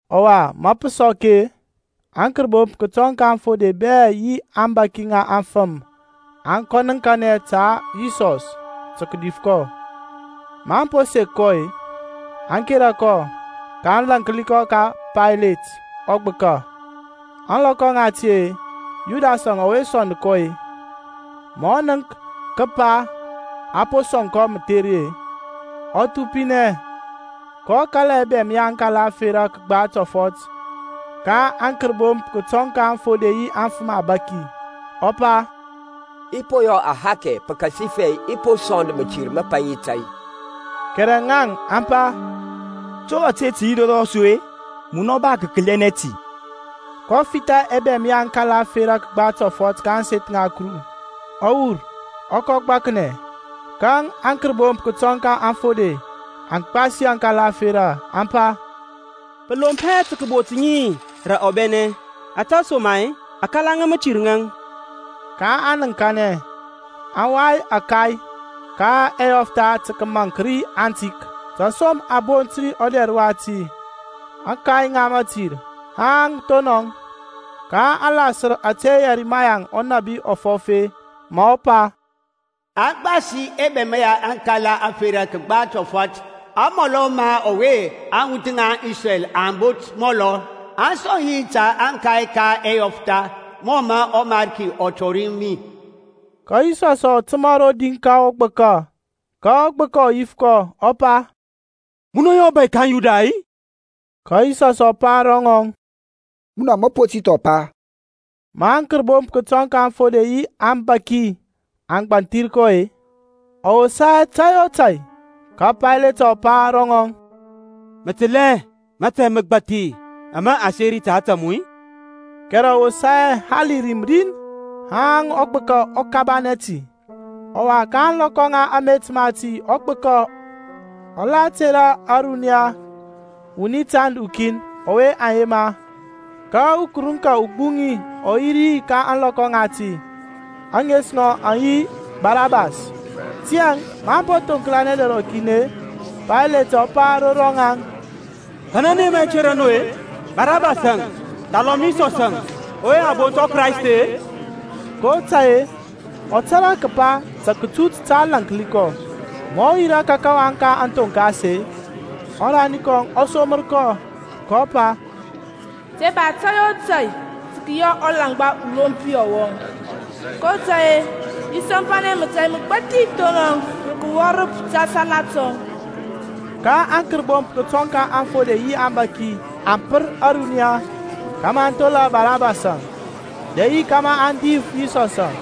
Ɔwa, ma pǝ sɔk-e, aŋkərbomp kǝtɔŋ ka aŋfode bɛ yi aŋbȧki ŋa aŋfǝm aŋ kɔ nǝŋkanɛ ta Yisɔs tǝ kǝdif kɔ. Maŋ po sek kɔ-e, aŋ kera kɔ, kaŋ lȧnki kɔ ka Paylet ɔgbǝka. Ȧŋlɔkɔ ŋati-e, Yudasȧŋ ɔwe sɔnd kɔ-e, ma ɔ nənk kǝpa a po sɔŋ kɔ mǝtheri-e, ɔ thupinɛ kɔ kala ɛbɛm ya aŋkala ȧferȧ kǝgba tɔfɔt ka aŋkərbomp kǝtɔŋ ka aŋfode yi aŋfǝm abȧki, ɔ pa, I po yɔ ahakɛ pǝkasifɛ i po sɔnd mǝtir mǝpaŋi tȧy. Kɛrɛ ŋaŋ, aŋ pa, To ȧte tǝ yi ro rɔsu-e? Munɔ ba kǝkǝlȧnɛ ti. kɔ fitha ɛbɛm ya ȧŋkala ȧferȧ kǝgba tɔfɔt ka ȧŋseth ŋa Kuru, ɔ wur, ɔ kɔ gbaknɛ. Ka aŋkərbomp kǝtɔŋ ka aŋfode aŋ gbasi aŋkala ȧferȧ, aŋ pa, Pǝ lomp hɛ tǝ kǝbot ŋi rǝ ɔbɛnɛ, ȧtesoma-e aŋkala ŋa mǝtir ŋaŋ. kaŋ nǝŋkanɛ, aŋ wai ȧkay ka ɛyɔftha tǝ kǝmaŋk ri atik. Tasom a bont ɔdɛr wati, Akay ka mǝtir, haŋ thonɔŋ. Ka a lasǝr ȧte Yɛrimaya ɔnȧbi ɔ fɔf-e, ma ɔ pa, A gbasi ɛbɛm ya aŋkala ȧferȧ kǝgba tɔfɔt, amɔlɔ ma ɔwe aŋwuth ŋa Isrɛl aŋ bot mɔlɔ, aŋ sɔŋ yi ta ȧkay ka ɛyɔftha, mɔ mǝ ɔMarki ɔ tɔri mi. Ka Yisɔsȧŋ ɔ tǝma rodi ka ɔgbǝka, ka ɔgbǝka ɔ yif kɔ, ɔ pa, Munɔ yi ɔbȧy ka aŋYuda-i? Ka Yisɔsȧŋ ɔ pa ro ŋɔŋ, Munɔ mǝ po ti thɔ pa. Ma aŋkərbomp kǝtɔŋ ka aŋfode yi aŋbȧki aŋ gbanthir kɔ-e, ɔ wosa hɛ tȧy o tȧy. Ka Paylet ɔ pa ro ŋɔŋ, Mǝ tǝl hɛ mȧtȧy mǝgbathi ama a seri ta ȧtȧ mu-i? Kɛrɛ ɔ wosa hɛ hali rim rin, haŋ ɔgbǝka ɔ kabanɛ ti. Ɔwa ka ȧŋlɔkɔ ŋa amet mati ɔgbǝka ɔ la tera ȧruniya wuni tand ukin, ɔwe aŋ yema. Ka ukǝrǝŋka ugbuŋi ɔ yi ri ka ȧŋlɔkɔ ŋati, ȧŋes ŋɔŋ aŋ yi Barabas. Tiyȧŋ, maŋ po thoŋklanɛ dɛr rɔkin-e, Pailatȧŋ ɔ pa ro rɔŋaŋ, Kanɛ nǝ yema i tera nu-e, Barabasȧŋ thalɔm Yisɔsȧŋ ɔwe a bont Kraist-e? kotȧy-e ɔ tȧrȧ kǝpa ta kǝtut tǝ aŋ lȧnki kɔ. Ma ɔ yirȧ ka kawaŋ ka kǝthoŋkas-e, ɔrani kɔŋ ɔ somǝr kɔ, kɔ pa, Te ba tȧy o tȧy tǝ kǝyɔ ɔlaŋgba ulompi ɔwɔŋ, kotȧy-e i sɔmpanɛ mətȧy mǝgbathi thonɔŋ rǝ kǝwɔrǝp ta sala tɔŋ. Ka aŋkərbomp kǝtɔŋ ka aŋfode yi aŋbȧki aŋ pǝr ȧruniya kȧmȧ aŋ thola Barabasȧŋ, dɛ yi kȧmȧ aŋ dif Yisɔsȧŋ.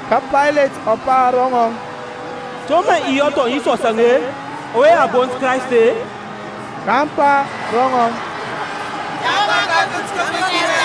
Ka Paylet ɔ pa ro ŋaŋ, To mǝ i yɔ thɔŋ Yisɔsȧŋ-e, ɔwe a bont Krayst-e? kaŋ pa ro ŋɔŋ, Tȧŋ kɔ ka akǝnt kǝpǝnkinɛ!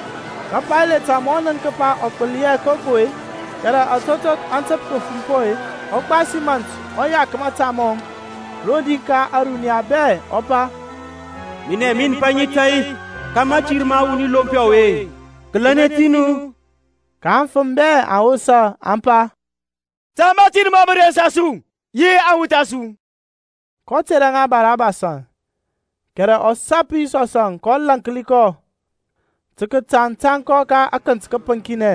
Ka Pailatȧŋ ma ɔ nənk kǝpa ɔ gbǝli hɛ koko-e, kɛrɛ atotok aŋ tǝp kǝfumpɔ-e, ɔ gbasi mȧnt ɔ yak mȧta mɔŋ rodi ka ȧruniya bɛ, ɔ pa, Minɛ min paŋi tȧy ka mȧtir ma ɔwuni lompi ɔwe. Kǝlɛnɛ ti nu. Ka aŋfǝm bɛ aŋ wosa, aŋ pa, Ta mȧtir mɔŋ mǝ rensa su, yi aŋwuth a su. kɔ tera ŋa Barabasȧŋ; kɛrɛ ɔ sap Yisɔsȧŋ kɔ lȧnki kɔ tǝ kǝtaŋ tȧŋ kɔ ka akǝnt kǝpǝŋkinɛ.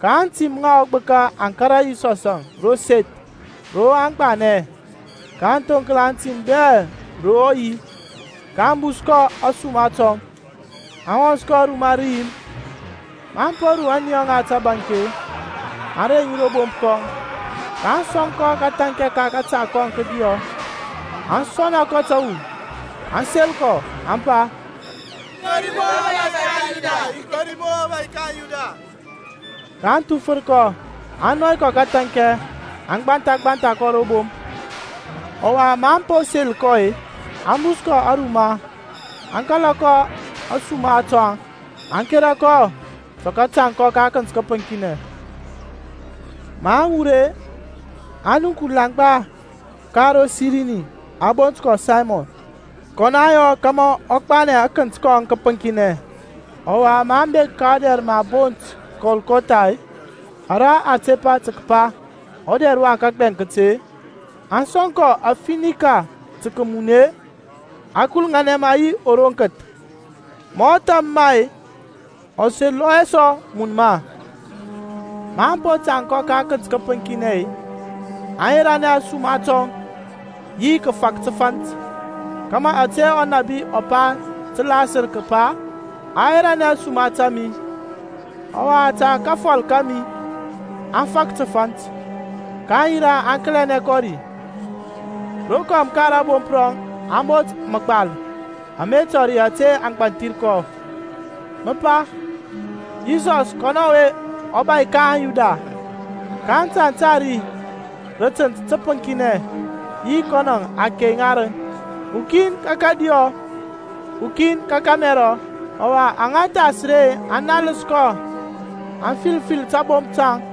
Ka aŋtim ŋa ɔgbǝka aŋ kȧrȧ Yisɔsȧŋ ro seth ro aŋ gbanɛ, kaŋ thoŋkla aŋtim bɛ ro ɔ yi. kaŋ bus kɔ ȧsuma tɔŋ, aŋ wɔns kɔ ruma rǝyim. Maŋ po ru ȧniyɔ ŋa tǝbȧnk-e, aŋ reŋ ŋi ro bomp rɔŋ, kaŋ sɔŋ kɔ kǝthȧnkɛ ka kȧta kɔŋ kǝdiyɔ, aŋ sɔna kɔ tǝwu, aŋ sel kɔ, aŋ pa, Kori mu-o, ɔbȧy ka aŋYuda! kaŋ thufǝr kɔ, aŋ nɔy kɔ kǝthȧnkɛ, aŋ gbantha gbantha kɔ ro bomp. Ɔwa maŋ po sel kɔ-e, aŋ bus kɔ aruma, aŋ kala kɔ ȧsuma tɔŋ, aŋ kera kɔ tǝ kǝtaŋ kɔ ka akǝnt kǝpǝŋkinɛ. Maŋ wur-e, aŋ nənk ulaŋgba ka ro Sirini, a bont kɔ Saymɔn. Kɔnɔ aŋ fɔs kȧmȧ ɔ gbanɛ akǝnt kɔŋ kǝpǝŋkinɛ. Ɔwa maŋ bek ka ɔdɛr mǝ a bont Kɔlkɔtha-e, ara a tepa tǝ kǝpa, Ɔdɛr wa kǝgbɛŋkǝt-e, aŋ sɔŋ kɔ afinika tǝ kǝmun-e, a kuluŋanɛ ma yi ɔroŋkǝth. Ma ɔ tham ma-e, ɔ selɔ hɛ sɔ mun ma. Maŋ po tȧŋ kɔ ka akǝnt kǝpǝnkinɛ-e, aŋ yeranɛ ȧsuma tɔŋ yi kǝfȧk tǝfȧnt, kȧmȧ ȧte ɔnȧbi ɔ pa tǝ lasǝr kǝpa, Aŋ yerȧnɛ ȧsuma ta mi, ɔwa ta kafɔl kȧmi aŋ fak tǝfant. kaŋ yirȧ aŋ kǝlȧnɛ kɔ ri. Rokɔm ka rȧbomp rɔŋ aŋ bot mȧgbal ama tɔri ȧte a gbanthir kɔ, mǝ pa, YISƆS KƆNƆ ƆWE ƆBȦY KA AŊYUDA. Ka a tȧŋ tȧŋ ri rǝ tǝnt tǝpǝŋkinɛ yi kɔnɔŋȧŋ, akey ŋarǝŋ, ukin ka kȧdiyɔ, ukin ka kȧmɛrɔ. Ɔwa aŋa thas ri aŋ nals kɔ aŋ fil fil tabomp taŋ,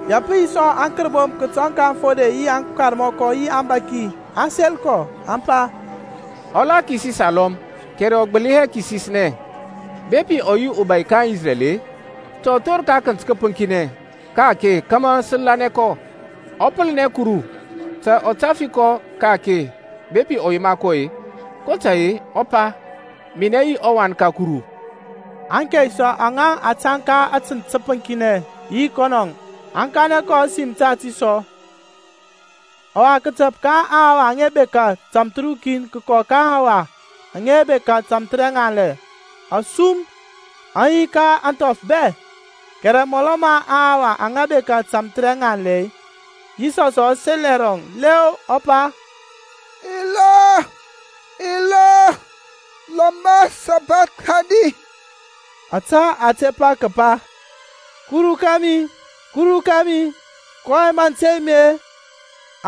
Ya pǝ yi sɔ aŋkərbomp kǝtɔŋ ka aŋfode yi aŋkarmɔkɔ yi aŋbȧki aŋ sel kɔ, aŋ pa, Ɔ la kisis alɔm, kɛrɛ ɔ gbǝli hɛ kisisnɛ. Bepi ɔ yi ɔbȧy ka aŋIsrɛl-e, ta ɔ thor ka akǝnt kǝpǝŋkinɛ ka-ake kȧmȧ sǝ lanɛ kɔ. Ɔ pǝlǝnɛ Kuru; ta ɔ tafi kɔ ka-ake bepi ɔ yema kɔ-e, kotȧy-e ɔ pa, Minɛ yi ɔWan ka Kuru. Aŋkey sɔ aŋa a tȧŋ ka atǝnt tǝpǝŋkinɛ yi kɔnɔ aŋ kanɛ kɔ ȧsim tati sɔ. Ɔwa kǝtǝp ka aŋhawa aŋa bekȧ tamthǝrukin kǝkɔ ka aŋhawa aŋa bekȧ tamthǝrɛŋanlɛ asum aŋ yi ka ȧŋthɔf bɛ. Kɛrɛ mɔlɔ ma aŋhawa aŋa bekȧ tamthǝrɛŋanlɛ-e, Yisɔsȧŋ ɔ sel ɛrɔŋ lɛɔ, ɔ pa, Ila, Ila, lama sabakthani? Ȧtȧ a tepa kǝpa, Kuru ka mi, Kuru kȧmi, kɔyɛŋ mǝ tey mi-e?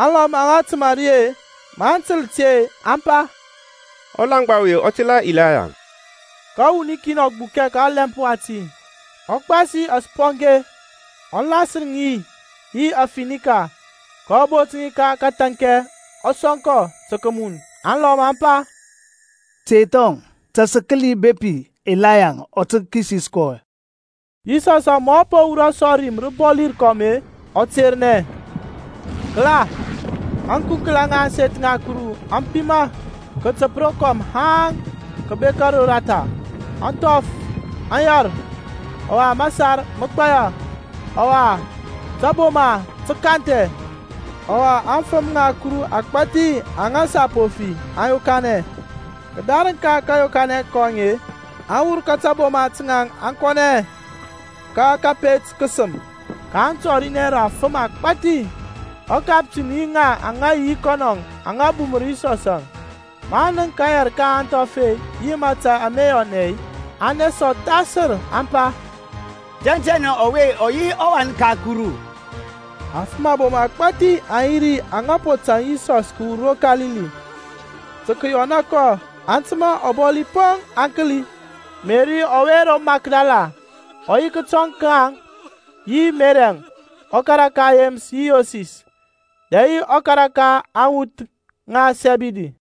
Alɔm aŋa tǝma ri-e, maŋ tǝl ti-e, aŋ pa, Ɔlaŋgba ɔwe ɔ tela Ilaya. Ka wuni kin ɔ gbukɛ ka ɔlɛmp wati, ɔ gbasi asponge, ɔ lasǝr ŋi yi afinika, kɔ bot ŋi ka kǝthȧnkɛ ɔ sɔŋ kɔ tǝ kǝmun. Aŋlɔm aŋ pa, Tey thɔŋ, ta sǝ kǝli bepi Ilaya ɔ tǝ re kisis kɔ. Yisɔsȧŋ ma ɔ po wurɔ sɔ rim rǝbɔli rǝkɔm-e, ɔ ternɛ. Kǝla, ȧŋkunkla ŋa ȧŋseth ŋa Kuru aŋ pima kǝtǝp rokɔm haŋ kǝbek roratha. Aŋthɔf aŋ yɛr, ɔwa masar mǝ gbaya, ɔwa taboma tǝ kanthɛ, ɔwa aŋfǝm ŋa Kuru agbȧthi aŋa sa po fi aŋ yokanɛ. Kǝdarǝŋ ka kȧyokanɛ kɔŋ-e, aŋ wur ka taboma ta ŋaŋ aŋ kɔnɛ ka kȧpet kǝsǝm, kaŋ tɔrinɛ rǝ afǝm agbȧthi. Ɔkaptin yi ŋaŋ aŋa yi yi kɔnɔȧŋ aŋa bumǝr Yisɔsȧŋ, maŋ nənk kayɛr ka aŋthɔf-e yi mȧtȧy ama yɔnɛ-e, aŋ nesa ɔthasǝr aŋ pa, Tɛntɛnɛ ɔwe ɔ yi ɔWan ka Kuru. Afǝm abom agbȧthi aŋ yi ri aŋa po tȧŋ Yisɔsȧŋ kǝwur ro Kalili, tǝ kǝyɔna kɔ, aŋ tǝma ɔbɔli poŋ aŋ kǝli. Meri ɔwe ro Makdala ɔ yi kǝtɔŋ ka ŋaŋ yi Meriȧŋ ɔkara ka Yemǝs yi Yoses, dɛ yi ɔkara ka aŋwuth ŋa Sɛbidi.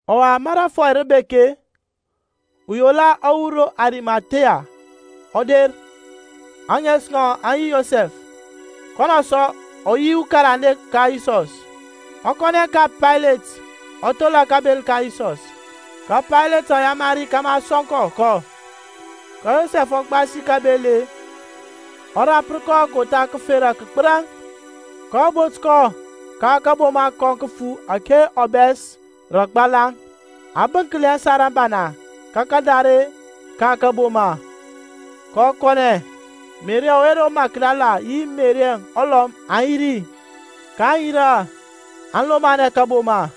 Ɔwa ma rȧfɔy rǝ po bek-e, uyola ɔ wur ro Arimathia ɔ der, ȧŋes ŋɔŋ aŋ yi Yosɛf, kɔnɔ sɔ ɔ yi ukarande ka Yisɔs. Ɔ kɔnɛ ka Paylet ɔ thola kabel ka Yisɔs. Ka Paylet ɔ yamari kȧmȧ a sɔŋ kɔ kɔ. Ka Yosɛf ɔ gbasi kȧbel-e, ɔ rapǝr kɔ kotha kǝfera kǝgbǝraŋ, kɔ bot kɔ ka kȧboma kɔŋ kǝfu ȧke a bɛs rǝ agbalaŋ, a bǝnkli ȧsar ȧbana ka kadare ka kȧboma, kɔ kɔnɛ. Meri ɔwe ro Makdala yi Meri ulɔm aŋ yi ri, kaŋ yirȧ aŋ lomanɛ kȧboma.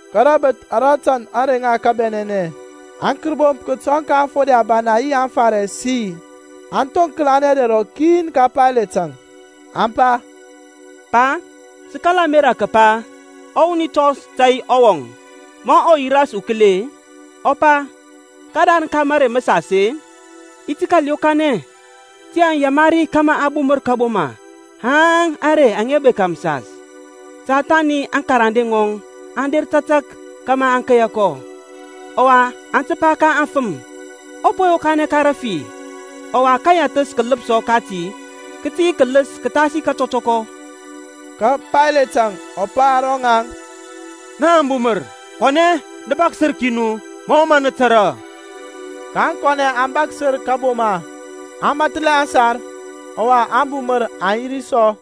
Ka rabǝth ara tand ȧŋrey ŋa kabɛnɛnɛ, aŋkərbomp kǝtɔŋ ka aŋfode ȧbana yi aŋFarisi aŋ thoŋklanɛ dɛr rɔkin ka Pailatȧŋ, aŋ pa, Pa, sǝ kala ȧmerȧ kǝpa ɔwuni tɔns tȧy ɔwɔŋ ma ɔ yi ras ukǝli-e, ɔ pa, Kǝdarǝŋ ka mǝrei mǝsas-e i ti kȧl yokanɛ. Tiyȧŋ yamari kȧmȧ a bumǝr kȧboma haŋ ȧŋrey aŋa bekȧ mǝsas, ta thani aŋkarande ŋɔŋ aŋ der tȧtȧk kȧmȧ aŋ keya kɔ, ɔwa aŋ pa ka aŋfǝm, Ɔ po yokanɛ ka rafi; ɔwa kayɛtha kǝlǝpsɔ kǝ tǝ yi kǝlǝs kǝthasi katɔtɔkɔ. Ka Pailatȧŋ ɔ pa ro ŋaŋ, Nǝ ba ubumǝr. Kɔnɛ nu nǝ bȧksǝr ki nu mɔ mǝ nǝ tȧrȧ. kaŋ kɔnɛ aŋ bȧksǝr kȧboma, aŋ mathlɛ aŋsar, ɔwa ȧŋbumǝr aŋ yi ri sɔ.